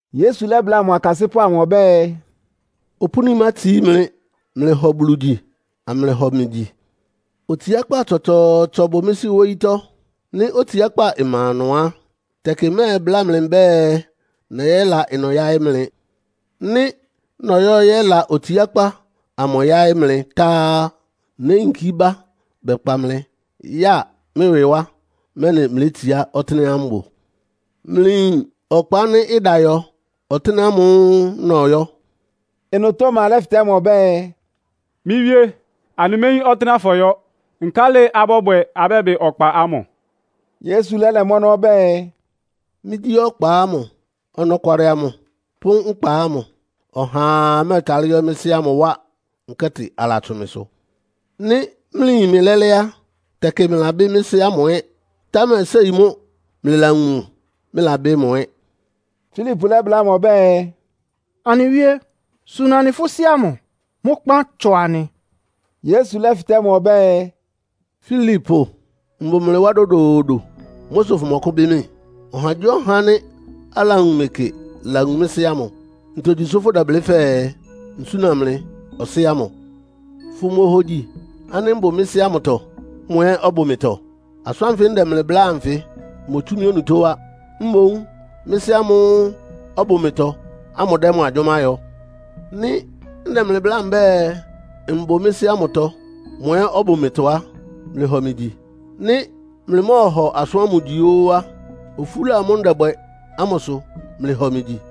Yesu lɛ́bláa mʋ akasɩ́pʋ́ amʋ ɔbɛ́ɛ, “Opúni mátsií mlɩ. Mlɩhɔ Bulu gyi, amlɩhɔ mɩ gyi. Otsiákpá tsɔtsɔɔtsɔ bʋ mɩ́ Sɩ́ wóyítɔ́. Nɩ́ otsiákpá ma ɩnʋ á, tɛkɩ mmɛbláa mlɩ mbɛ́ɛ nɛyɛ́la ɩnʋ yáɩ́ mlɩ. Nɩ́ nɔyɔ́ yɛ́la otsiákpá amʋ yáɩ́ mlɩ tá á, néyinkí bá bɛkpa mlɩ yáa mɩ́ ɩwɩ wá, mɛ́nɩ mlétsiá ɔtɩ́nɛ́á mbʋ. Mlɩyin ɔkpa ánɩ́ ɩda yɔ ɔtɩ́nɛ́ ámʋ́ʋ́ nɔyɔ́.” Ɩnʋ Toma lɛ́fɩtɛ́ mʋ ɔbɛ́ɛ, “Mɩ́ Wíé, anɩméyín ɔtɩ́nɛ́á fɔyɔ́, nkálɩ abɔ́bwɛ abɛ́bɩ ɔkpa ámʋ?” Yesu lɛ́lɛ mʋ́ ɔnɔ́ ɔbɛ́ɛ, “Mɩ́gyí ɔkpa ámʋ, ɔnɔkwalɩ amʋ pʋ́ nkpa ámʋ. Ɔhaa mɛ́ɛtalɩ́ yɔ́ mɩ́ Sɩ́ ámʋ wá, nkɛ́tɩ alatsʋn mɩsʋ. Nɩ́ mlɩyin mɩ lɛ́lɛ́ á, tɛkɩ mlɩlabɩ́ mɩ́ Sɩ́ ámʋ ɛ́. Támɛ séi mʋ́ mlɩlawun mʋ, mlɩlabɩ́ mʋ ɛ́.” Filipo lɛ́bláa mʋ ɔbɛ́ɛ, “Anɩ Wíé, suna anɩ fʋ́ Sɩ́ ámʋ. Mʋ́ kpán tsɔ anɩ.” Yesu lɛ́fɩtɛ́ mʋ ɔbɛ́ɛ, “Filipo! Mbʋ mlɩ wá dodoodo. Mʋ́ sʋ fʋmɔkʋ́bɩ́ mɩ́? Ɔhagyíɔha ánɩ́ alawun mɩ kɩ lawun mɩ́ Sɩ́ ámʋ. Ntogyi sʋ́ fʋ́dɛblɩ́ fɛɛ, nsúna mlɩ Ɔsɩ́ ámʋ? Fʋmohogyi ánɩ́ mbʋ mɩ́ Sɩ́ ámʋtɔ, mʋ ɛ́ ɔbʋ mɩtɔ? Asʋ́n ánfɩ ndɛ mlɩ bláa anfɩ motsú mɩ́ onutó wá. Mboún mɩ́ Sɩ́ ámʋ́ʋ́ ɔbʋ mɩtɔ ámʋ dɛ́ mʋ agyʋ́má yɔ. Nɩ́ ndɛ mlɩ bláa mbɛ́ɛ, mbʋ mɩ́ Sɩ́ ámʋtɔ, mʋ ɛ́ ɔbʋ mɩtɔ á, mlɩhɔ mɩ gyi. Nɩ́ mlɩmɔ́ɔhɔ asʋ́n ámʋsʋ gyi óó á, ofúla amʋ́ʋ́ ndɛbwɛ ámʋ sʋ mlɩhɔ mɩ gyi.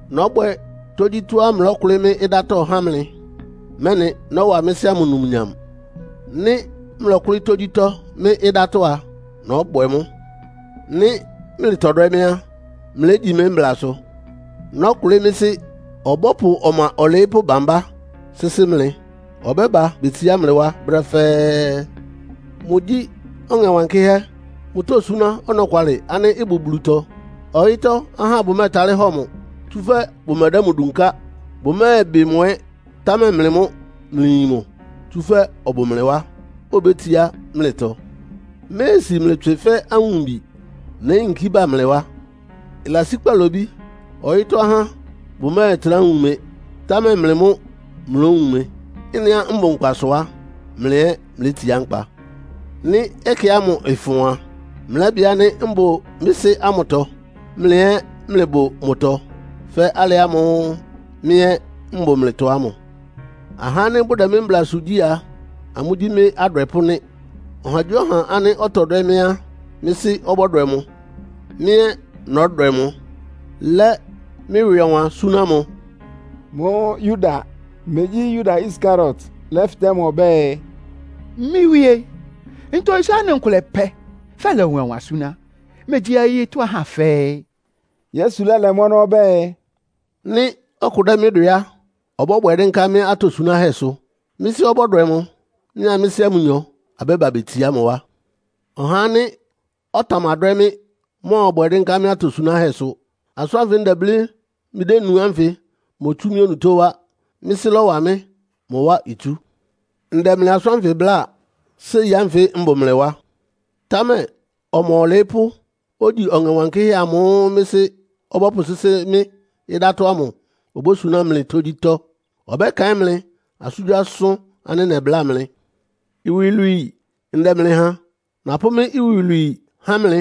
Nɔ́bwɛ tógyítɔ́á mlɔ́kʋlɩ́ mɩ́ ɩdátɔ́ há mlɩ, mɛ́nɩ nɔ́wa mɩ́ Sɩ́ ámʋ numnyam. Nɩ́ mlɔkʋ́lɩ́ tógyítɔ́ mɩ́ ɩdátɔ́ á, nɔ́bwɛ mʋ́. “Nɩ́ mlɩtɔdwɛ́ mɩ́ á, mlégyi mɩ́ mblasʋ. Nɔ́kʋlɩ́ mɩ́ Sɩ́, ɔbɔ́pʋ Ɔma Ɔlɩɩ́pʋ́ bambá sɩ́sɩ́ mlɩ, ɔbɛ́ba betsiá mlɩ wá brɛ́ fɛ́ɛ́. Mʋgyí Ɔŋɛ Wankɩ́hɛ́. Mʋtósúná ɔnɔkwalɩ ánɩ́ ɩbʋ Bulutɔ. Ɔyɩ́tɔ́ ahá bʋmɛ́ɛtalɩ́ hɔ mʋ, tsúfɛ́ bʋmɛdɛ́ mʋ dunká. Bʋmɛ́ɛbɩ mʋ ɛ́, támɛ mlɩ mʋ́ mlɩyin mʋ, tsúfɛ́ ɔbʋ mlɩ wá, obétsiá mlɩtɔ. “Mméesi mlɩ tswɩ fɛ́ awumbi. Néyinkí bá mlɩ wá. Ɩlasí kpalobí ɔyɩ́tɔ́ ahá bʋmɛ́ɛtrá wun mɩ, támɛ mlɩ mʋ́ mlówun mɩ. Ɩ́nɩá mbʋ nkpa sʋ á, mlɩ ɛ́ mlétsiá nkpa. Nɩ́ ɛkɛ ámʋ ɩfʋn a, mlɛ́bɩ ánɩ́ mbʋ mɩ́ Sɩ́ ámʋtɔ. Mlɩ ɛ́ mlɩbʋ mɩtɔ fɛ́ alɩ ámʋ́ʋ́ mɩ́ ɛ́ mbʋ mlɩtɔ ámʋ. “Ahá ánɩ́ bʋdɛ mɩ́ mblasʋ gyí a, amʋ́gyí mɩ́ adwɛpʋ́ nɩ́. Ɔhagyíɔha ánɩ́ ɔtɔdwɛ́ mɩ́ á, mɩ́ Sɩ́ ɔbɔ́dwɛ mʋ. Mɩ́ ɛ́ nɔ́dwɛ mʋ, lɛ́ mɩ́ ɩwɩ ɔwan súná mʋ.” Mʋ́ʋ́ Yuda (megyí Yuda Iskariot) lɛ́fɩtɛ́ mʋ ɔbɛ́ɛ, “Mɩ́ Wíe, ntogyi sʋ́ anɩ nkʋlɛ pɛ́ fɛ́lɛ ɩwɩ ɔwan súná, megyí ɔyɩ́tɔ́ ahá fɛ́ɛ́?” Yesu lɛ́lɛ mʋ́ ɔnɔ́ ɔbɛ́ɛ, “Nɩ́ ɔkʋ dɛ́ mɩ́ dwɛ á, ɔbɔ́bwɛ dɩ́nká mɩ́ atosunáhɛ́sʋ. Mɩ́ Sɩ́ ɔbɔ́dwɛ mʋ. Mɩ́a mɩ́ Sɩ́ ámʋ nyɔ abɛ́ba betsiá mʋ wá. Ɔhá ánɩ́ ɔtamadwɛ́ mɩ́ ɔmɔ́ɔbwɛ dɩ́nká mɩ́ atosunáhɛ́sʋ. Asʋ́n ánfɩ ndɛblɩ́ mlɩdénu ánfɩ motsú mɩ́ onutó wá. Mɩ́ Sɩ́ lɔ́wa mɩ́, mʋ wá itsú. “Ndɛ mlɩ asʋ́n ánfɩ bláa, séi ánfɩ mbʋ mlɩ wá. Támɛ Ɔma Ɔlɩɩ́pʋ́, ogyi Ɔŋɛ Wankɩ́hɛ́ amʋ́ʋ́ mɩ́ Sɩ́ ɔbɔ́pʋsɩ́sɩ́ mɩ́ ɩdátɔ́ ámʋ obósuná mlɩ tógyítɔ́. Ɔbɛ́kaɩ́n mlɩ asʋ́ngyíasʋ́n ánɩ́ nɛbláa mlɩ. “Iwilwii ndɛ mlɩ ha! Napʋ́ mɩ́ iwilwii há mlɩ.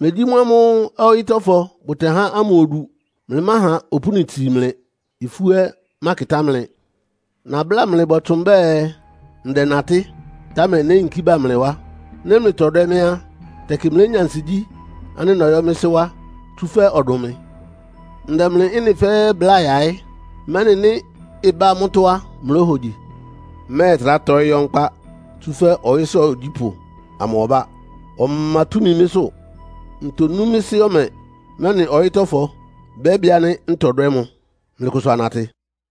Megyí mʋ́ ámʋ́ʋ́ ɔyɩ́tɔ́fɔ bʋtɛhá ámʋ odu. Mlɩmáha opúni itsii mlɩ. Ifú ɛ́ mákɩtá mlɩ. Nabláa mlɩ bɔtsʋn mbɛ́ɛ, ndɛnatɩ́, támɛ néyinkí bá mlɩ wá. Nɩ́ mlɩtɔdwɛ́ mɩ́ á, tɛkɩ mlénya ansigyí ánɩ́ nɔyɔ́ mɩ́ Sɩ́ wá, tsúfɛ́ ɔdʋn mɩ. Ndɛ mlɩ ɩ́nɩ fɛ́ɛ́ bláa yaɩ́, mɛ́nɩ nɩ́ ɩbá mʋ́tɔ́ á, mlóhogyi. Mmɛ́ɛtrá tɔɩ́ yɔ́ nkpá, tsúfɛ́ ɔyɩ́sʋ́ ogyípʋ́ ámʋ ɔbá. Ɔma túmi mɩ́sʋ́. Ntonú mɩ́ Sɩ́ ɔmɛ, mɛ́nɩ ɔyɩ́tɔ́fɔ bɛ́bɩ ánɩ́ ntɔdwɛ́ mʋ. “Mlɩkʋsʋ anatɩ.”